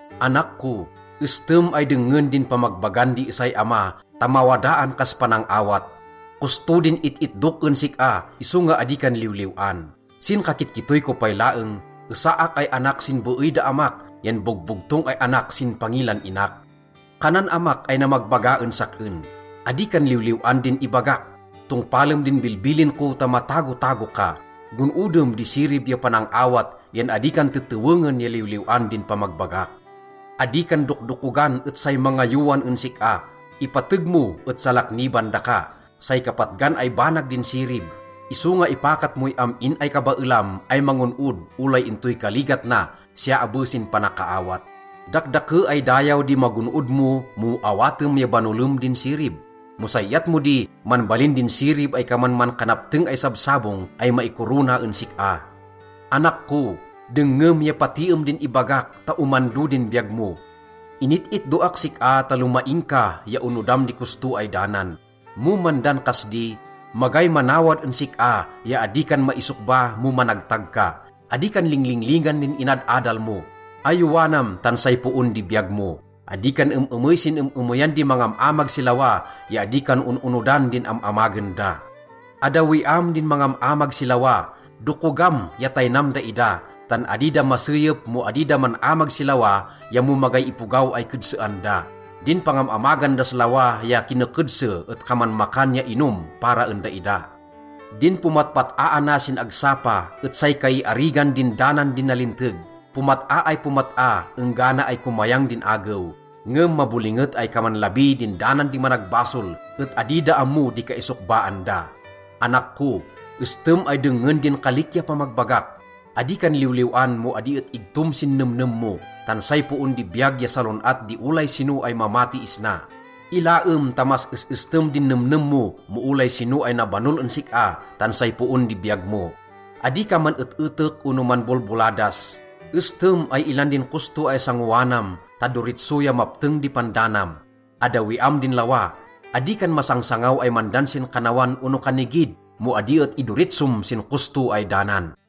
Anak ko, estem ay dengngen din pamagbagan di esay ama ta mawadaan kas panang-awat. Kosto din it-itdok en sik-a, isonga adi kan liwliw-an. Sin kakitkittoy ko pay laeng, esaak ay anak sin beey da amak yan bogbogtong ay anak sin pangilan inak. Kanan amak ay namagbaga en sak-en, “Adi ka liwliw-an din ibagak. Tongpalem din bilbilin ko ta matagotago ka. Gon-odem di sirib ya panang-awat yan adi kan tetewengen ya liwliw-an din pamagbagak. Adi kan dokdokogan et say mangayowan en sik-a, ipateg mo et salakniban daka. Say kapatgan ay banag din sirib, isonga ipakat moy am-in ay kabaelam ay mangon-od olay intoy kaligat na, siya abe sin panakaawat. Dakdake ay dayaw di magon-od mo mo awatem ya banolem din sirib. Mo say iyat mo di, manbalin din sirib ay kaman mankanapteng ay sabsabong ay maikorona en sik-a.” Anak ko, dengngem ya patiem din ibagak ta omando din biyag mo. Init-itdoak sik-a ta lomaing ka ya onodam di kosto ay danan. Mo mandan kas di, magay manawad en sik-a ya adi kan maisokba mo managtag ka. Adi kan linglinglingan din inad-adal mo. Ayowanam tan say poon di biyag mo. Adi kan em-emey sin em-emeyan di mangam-amag si lawa ya adi kan on-onodan din am-amagen da. Addawiam din mangam-amag si lawa, dokogam ya taynam daida. Tan adi da maseyep mo adi da man-amag si lawa ya mo magay ipogaw ay kedsean da. Din pangam-amagan das lawa ya kinekedse et kaman makan ya inom para en daida. Din pomatpat-aana sin agsapa et say kaiarigan din danan di nalinteg. Pomat-a ay pomat-a enggana ay komayang din agew. Ngem mabolinget ay kaman labi din danan di managbasol et adi da ammo di kaisokbaan da. Anak ko, estem ay dengngen din kalik ya pamagbagak. Adi kan liwliw-an mo adi et igtom sin nemnem mo. Tan say poon di biyag ya salon-at di olay sino ay mamati isna. Ilaem ta mas es-estem din nemnem mo mo olay sino ay nabanol en sik-a, tan say poon di biyag mo. Adi ka man-et-etek ono manbolboladas. Estem ay ilan din kosto ay sangoanam ta doritso ya mapteng di pandanam. Addawiam din lawa. Adi kan masangsangaw ay mandan sin kannawan ono kannigid mo adi et idoritsom sin kosto ay danan.